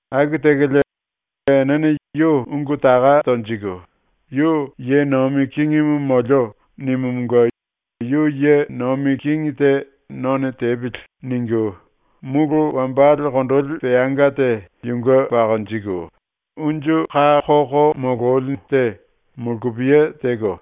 Aku tekolie enene yu ungu taka tonjiku ⸤‘Yu “Ye nomi kingimu molio.” nimumunge yu ye nomi kingi te none tepili.’ ningu⸥ mulu wambale kondoli peanga te yunge pakonjiku, unju ka koko molorumu te mulkupiye teko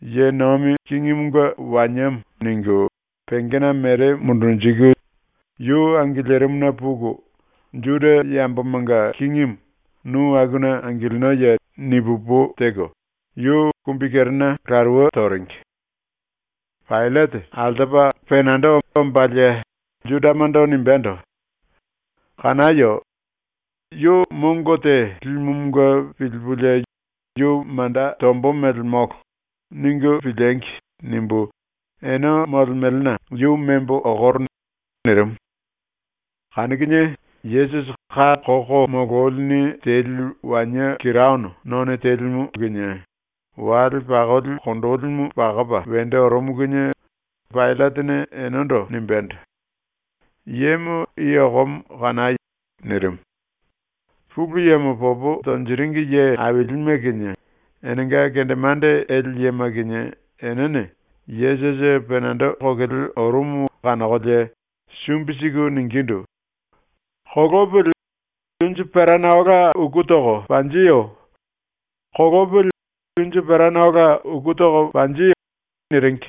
‘Ye nomi kingimunge waniemo.’ ningu pengena mere mundunjiku yu angilirimuna puku “Juda yambomanga kingimu, nu akuna angilinoye?” ni pu opu teko, yu kumbikerena laruwe toringi. Paillate altopa penando ombalie Judamando nimbendo: “Kanayo! ‘ ‘Yu mongo te limumunge pilipulie yu manda tombo mele molo.’ ningu piliengi!’ nimbu ene molemelena yu membo okoro.” nirimu. Kanu kinie Yesusi ka koko mololini teli wanie kiraono none telimu kinie wale pakoli kondolimu pakopa wendo orumu kinie Paillatene enendo nimbendo: “Yemo i okomo kanai!” nirimu. Pulu Yemo popo tonjiringi ye ailime kinie enenga kendemande ele yema kinie enene Yesusi penando kokele orumu kanokolie sumbi siku ningindu: “Kolopili, unju perana ola uku toko panjiyo! Kolopili unju perana ola uku toko panji!” niringi.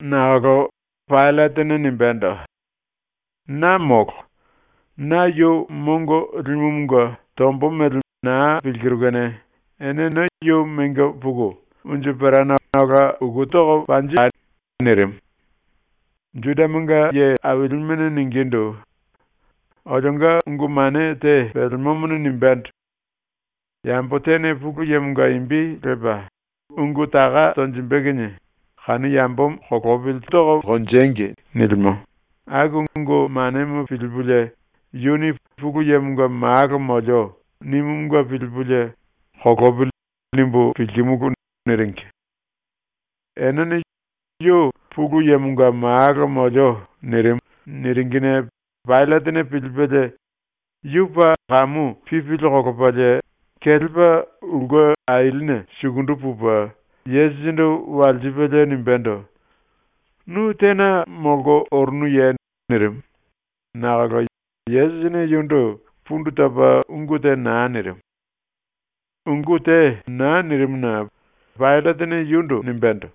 Nakolo Paillatene nimbendo: “Na molo. Na yu mongo limumunge tombo mele naa pilkiru kene enene yu mengo puku unju perana ola uku tai!” nirimu. Judamanga ailimene ningindu: “Olionga ungu mane te pelemomone nimbendo: ‘Yambo tene Pulu Yemonga imbi lepa ungu taka tonjimbe kinie, kanu yambomo kolopili tangi.’ nilimo, aku ungu manemo pilipulie yuni “Pulu Yemonga Malo molio.” nimumunge pilipulie ‘Kolopili.’ nimbu pilkimulu.” niringi. Enene “Yu “Pulu Yemonga Malo molio.” nirimu.” niringine Paillatene pilipelie yu paa kamu pipili kolopalie, kelepa ulke ailine sukundu pupe Yesusindu walsipelie nimbendo: “Nu tena molko orunuye?” nirimu, nakolo Yesusini yundu pundu topa ungu te naa nirimu. Ungu te naa nirimuna Paillatene yundu nimbendo: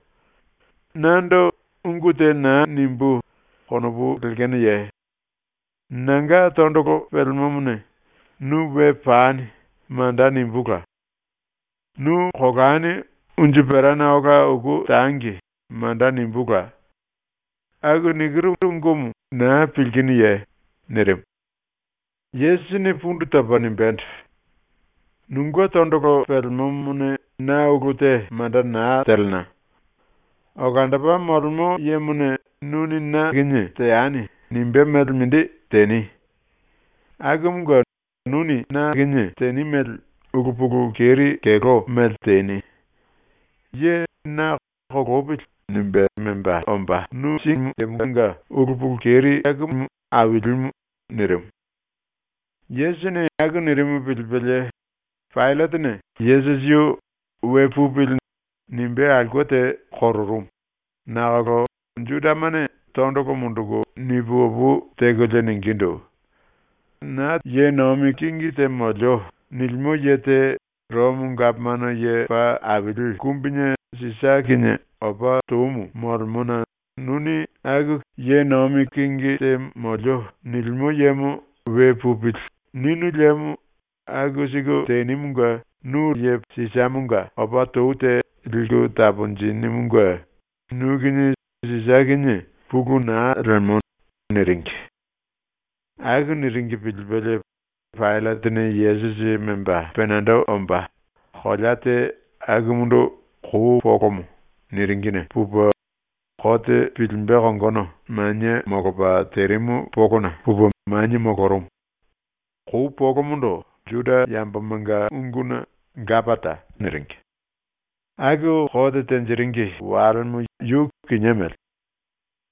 “Nando ‘Ungu te naa nimbú.’ konopu lekenoye? Nanga tondolo pelemomone “Nu we pani.” manda nimbúla; “Nu kolani unju perana ola uku tangi.” manda nimbúla. Aku nikiru ungumu naa pilkinuye?” nirimu. Yesusini pundu topa nimbendo: “Nunge tondolo pelemomone na ulu te manda naa telena. Olandopa Molemo Yemone ‘Nuni na teani.’ nimbé mele mindi teni. Akumunge nuni na teni mele ulu pulu keri keló mele teni. Ye na ‘Kolopili.’ ningu mengo ongo nu síngi yemanga ulu pulu keri akumu ailimu.” nirimu. Yesusini aku nirimu pilipelie Paillatene Yesusi yu “We pupili.” nimbé aulke te kororumu, nakolo Judamane tondolo munduku ni pu opu tekolie ningindu: “ “Na kingi te molio.” nilimo ye te Romo Gapomano Ye Paa Aili Kumbine Sisa kinie opa toumu molemona nuni aku “Kingi te molio.” nilimo yemo “We pupili.” ninu liemo aku siku tenimunge nu Romo Gapomano Ye Paa Aili Kumbine Sisamonga opa tou te liku taponjinimunge nu kinie Sisa kinie pulu naa lemo.” niringi. Aku niringi pilipelie Paillatene Yesusi memba penando omba, kolea te akumundu ‘kou polomo’ niringine pupe kote pilimbe kongono manie molopa terimu polona pupe manie molorumu. (Kou polomondo Juda yambomanga unguna ‘Gapata’ niringi.) Aku kote tenjiringi walemo yu kinié mele.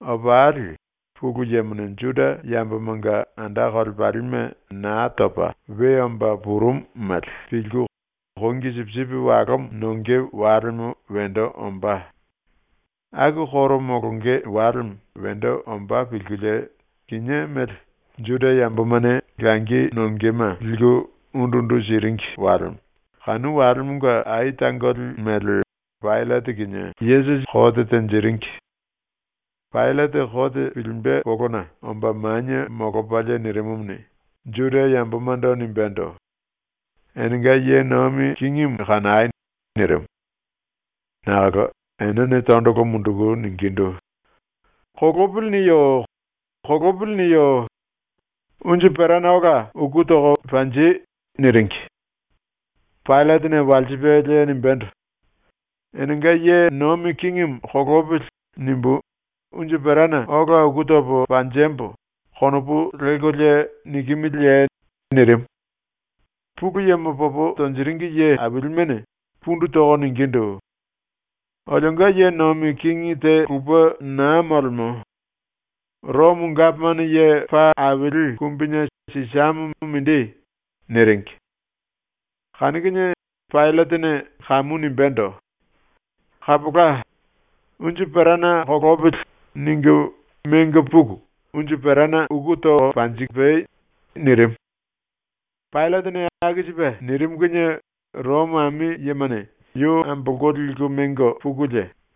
Opali Pulu Yemone Juda yambomanga anda kolepalime Naa Topa We Omba Purumu mele pilku kongi sipisipi walomo nonge walemo wendo ombá. ⸤Aku koro molonge walemo⸥ wendo ombá pilkulie kinié mele Juda yambomane langi nongema liku undu undu siringi walemo, kanu walemonga ai tangoli mele, Paillate kinie kote tenjiringi. Paillate kote pilimbe polona omba manie molopalie nirimumuni, Juda yambomando nimbendo: “Enenga ye nomi kingimu kanai!” nirimu. Nakolo enene tondolo munduku ningindu: “ “Kolopili.” niyo! “Kolopili.” niyo! Unju perana ola uku toko panji!” niringi. Paillatene walsipelie nimbendo: “‘ ‘Enenga ye nomi kingimu kolopili.’ nimbu unju perana ola uku topo panjembo.’ konopu lelkolie nikimiliye?” nirimu. Pulu Yemo popo tonjiringi ye ailimene pundu toko ningindu: “Olionga ye nomi kingi te lupe naa molemo. Romo Gapomano Ye Paa Aili Kumbine Sisamo mindi.” niringi. Kanu kinie Paillatene kamu nimbendo: “Kapola, ‘Unju perana kolopili.’ ningu mengo puku unju perana uku toko panjipai.” nirimu. Paillatene aku sipe nirimu kinie Romo ami yemane yu ambolko liku mengo pukulie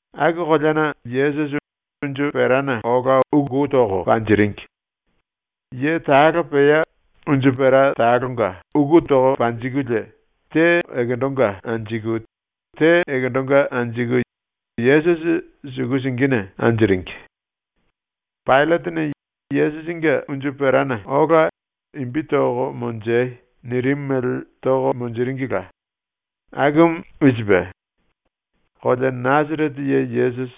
Aku koleana Yesusi unju perana ola uku toko panjiringi. Ye talo pea unju pera talonga uku toko panjikulie, te ekendonga anjiku te ekendonga anjiku Yesusi suku singine anjiringi. Paillatene “Yesusinge unju perana ola imbi toko monjei.” nirimu mele toko monjiringila. Akumu i sipe: KOLEA NASARETE YE YESUSI,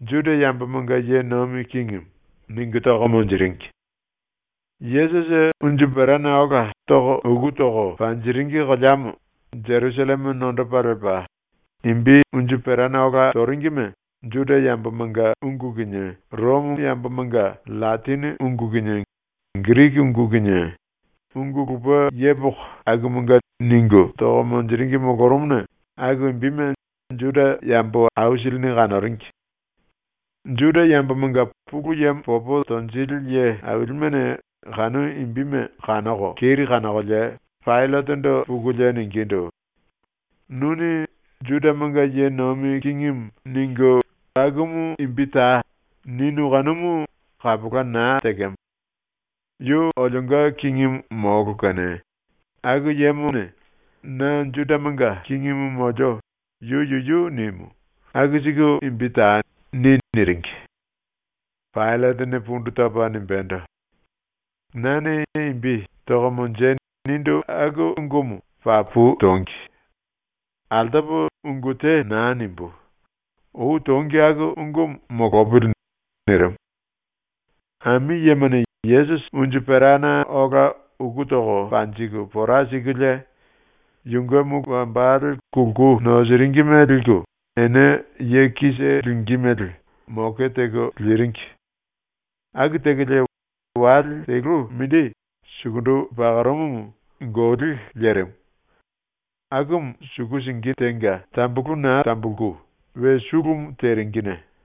JUDA YAMBOMANGA YE NOMI KINGIMU ningu toko monjiringi. Yesusi unju perana ola uku toko panjiringi koleamo Jerusalleme nondopa lepa, imbi unju perana ola toringime Juda yambomanga ungu kinie ⸤Romo yambomanga⸥ LLatini ungu kinie Giriki ungu kinie, ungu lupe yepoko akumanga ningu toko monjiringi molorumuna aku imbime Juda yambo aisilini kanoringi. Juda yambomanga Pulu Yemo popo tonjili ye ailimene kanu imbime kanoko keri kanokolie Paillatendo pukulie ningindu: “Nuni “Judamanga ye nomi kingimu” ningu “Akumu imbi tai.” ninu kanumu kapola naa tekemo. ⸤Yu olionga kingimu molo kene⸥ ‘Aku yemone “Na Judamanga kingimu molio.” yu yuyu nimu.’ “Aku siku imbi tai.” ni.” niringi. Paillatene pundu topa nimbendo: “Nane imbi “Toko monjei.” nindu aku ungumu papu tongi. Altopo ungu te naa nimbú. Ou tongi aku ungumu molopili.” nirimu. Ami yemane Yesusi unju perana ola uku toko panjiku pora sikulie, yunge mulu wambale ⸤kulku nosiringime⸥ liku, ene ye kise lingí mele moke teko liringi. Aku tekolie wale telu mindi, sukundu pakorumumu, goli lerimu. Akumu suku singi tenga tambulu naa tambulku we sulumu teringine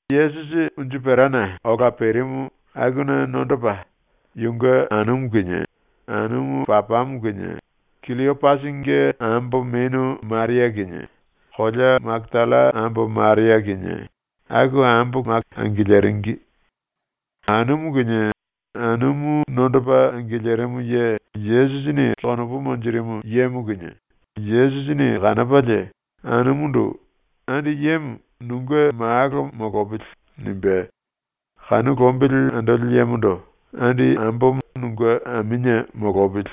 Yesusi unju perana ola perimu akuna nondopa yunge anumu kinie, anumu papamo kinie, Killiopasinge ambo menu Maria kinie, kolea Makatalla ambo Maria kinie, aku ambo kise angiliringi. Anumu kinie anumu nondopa angilirimu ye Yesusi konopu monjirimu yemo kinie Yesusini kanopalie anumundu “Andi yemo nunge malo molopili.” nimbe, kanu lombili andoli yemondo “Andi ambomo nunge aminie molopili.”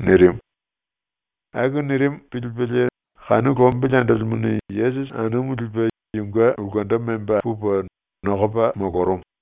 nirimu. Aku nirimu pilipelie lombili andolimuni Yesusi anumu lipe yunge ulkendo memba pupe nokopa molorumu.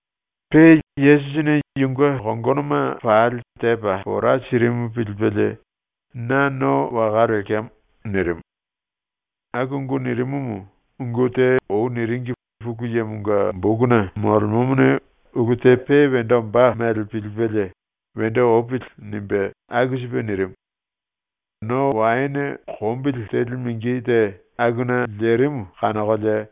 Pe Yesusini yunge kongonoma pali tepa pora sirimu pilipelie, “Na no waka lekemo.” nirimu. Aku ungu nirimumu ungu te ou niringi Pulu Yemonga bokuna molemomone ulu te pe wendo ombá mele pilipelie ‘Wendo opili.’ nimbe aku sipe nirimu. No waene kombili teli mingi te akuna lerimu kanokolie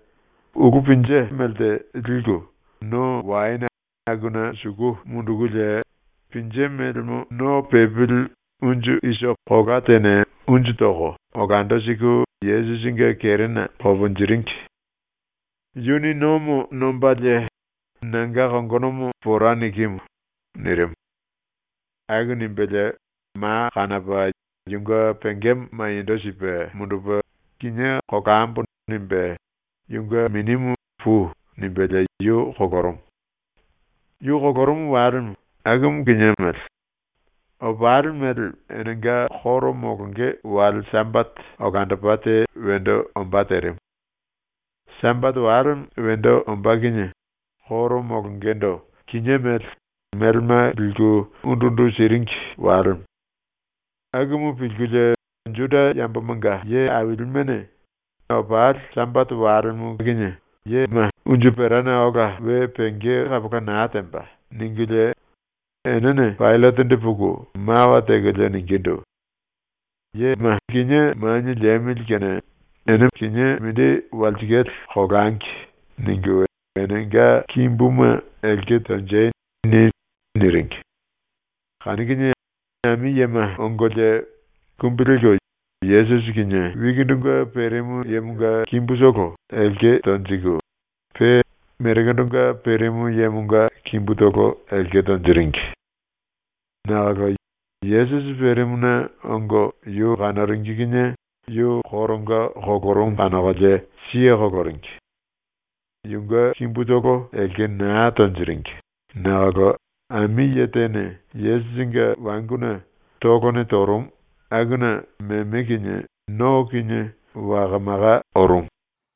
ulú pinje melte liku no waene akuna suku mundukulie, pinje melemo no pepili unju isopi kola tene unju toko olando siku Yesusinge kerena koponjiringi. Yuni nomo nombalie “Nanga kongonomo pora nikimu.” nirimu. Aku nimbelie ma kanopa yunge pengemo maniendo sipe mundupe ‘Kinié kolambo.’ nimbe yunge minimu “Pui.” nimbelie yu kolorumu. Yu kolorumu walemo akumu kinié mele, opali mele enenga koro molonge wale Sambate olandopa te wendo ombá terimu. Sambate walemo wendo ombá kinie koro molongendo kinié mele, melema liku undu undu siringi walemo. Akumu pilkulie Juda yambomanga ye ailimene ‘Opali Sambate walemo kinie yema unju perana ola we penge kapola naa temba.’ ningulie enene Paillatendo puku mawa tekolie ningindu: “Ene kinié manie liemili kene ⸤‘Ene mindili aili nongolie kinié mindi walsikale kolangi.’⸥ ningu “Enenga kimbuma elke tonjei.” ni.” niringi. Kanu kinie ami yema ongolie kumbi lelko Yesusi kinie wikindunge perimu yemonga kimbutolo elke tonjiku, pe merekendonga perimu yemonga kimbutolo elke tonjiringi. Nakolo Yesusi perimuna ongo yu kanoringi kinie yu koronga kolorumu kanokolie siye koloringi. Yunge kimbutolo elke naa tonjiringi nakolo ami ye tene Yesusinge wanguna tolone torumu, akuna meme kinie no kinie waka maka orumu.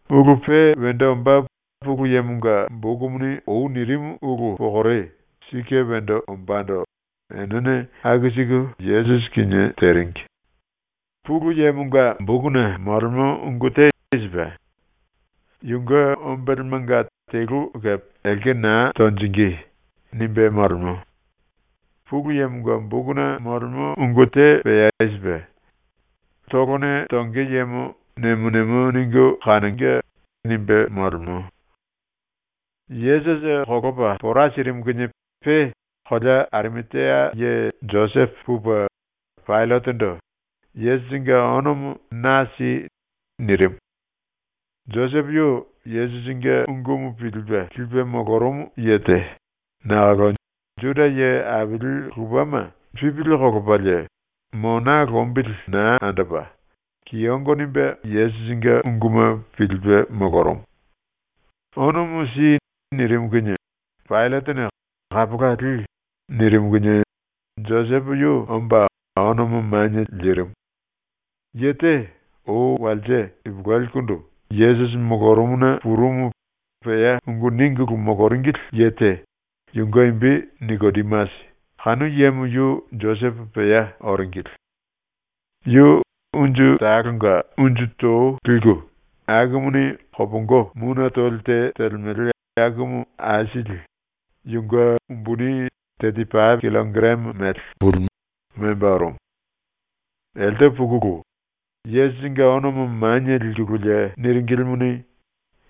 Ulu pe wendo ombá Pulu Yemonga bokumuni ou nirimu ulu pokore sike wendo ombando enene aku siku Yesusi kinie teringi. Pulu Yemonga bokuna molemo ungu te i sipe: ‘Yunge ombelemanga telu kepe elke naa tonjingí.’ nimbe molemo. Pulu Yemonga bokuna molemo ungu te pea i sipe: ‘Tolone tonge yemo nemo nemo ningu kanonge.’ nimbe molemo. Yesusi kolopa pora sirimu kinie pe kolea Arimatia ye Josepo pupe Paillatendo “Yesusinge onomo na si.” nirimu. Josepo yu Yesusinge ungumu pilipe lipe molorumu ye te, nakolo Juda ⸤ye aili lupe⸥ ma pipili kolopalie mona lombili naa andopa kiyongo nimbe Yesusinge unguma pilipe molorumu. “Onomo si.” nirimu kinie Paillatene “Kapola, li.” nirimu kinie Josepo yu omba onomo manie lirimu. Ye te, ou walse ipuluelikundu Yesusi molorumuna purumu pea ungu ningulu moloringili ye te, yunge imbi Nikodimasi, kanu yemo yu Josepo pea oringili. Yu unju talonga unju to liku akumuni kopongo mune toli te telemele akumu aisili, yunge umbuni teti pape killokarame mele, memba orumu. Elte pukulu Yesusinge onomo manie likululie niringilimuni,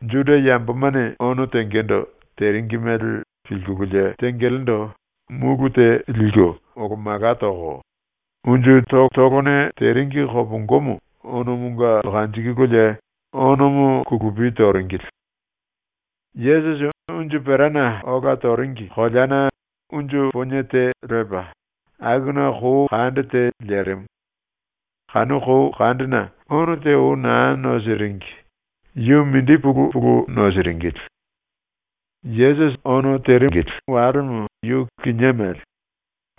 ⸤Juda yambomane ono tengendo teringi mele pilkululie tengelendo⸥ múlu te liku olo mala toko, unju totolone teringi kopongomo onomonga kanjikululie onomo kulupi toringili. Yesusi unju perana ola toringi koleana unju ponie te lepa, akuna kou kande te lerimu. Kanu kou kandena ono te ou naa nosiringi, yu mindi pulu pulu nosiringili. Yesusi ono terimu walemo yu kinié mele,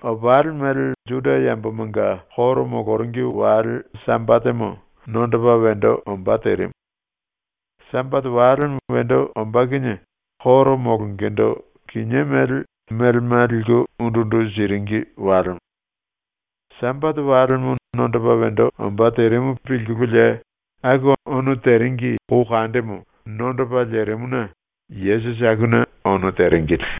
opali mele ⸤Juda yambomanga koro moloringi⸥ wale Sambatemo nondopa wendo ombá terimu. Sambate walemo wendo ombá kinie koro molongendo kinié mele, melema liku undu undu siringi walemo. Sambate walemo nondopa wendo ombá terimu pilkululie aku ono teringi kou kandemo nondopa lerimuna Yesusi akuna ono teringili.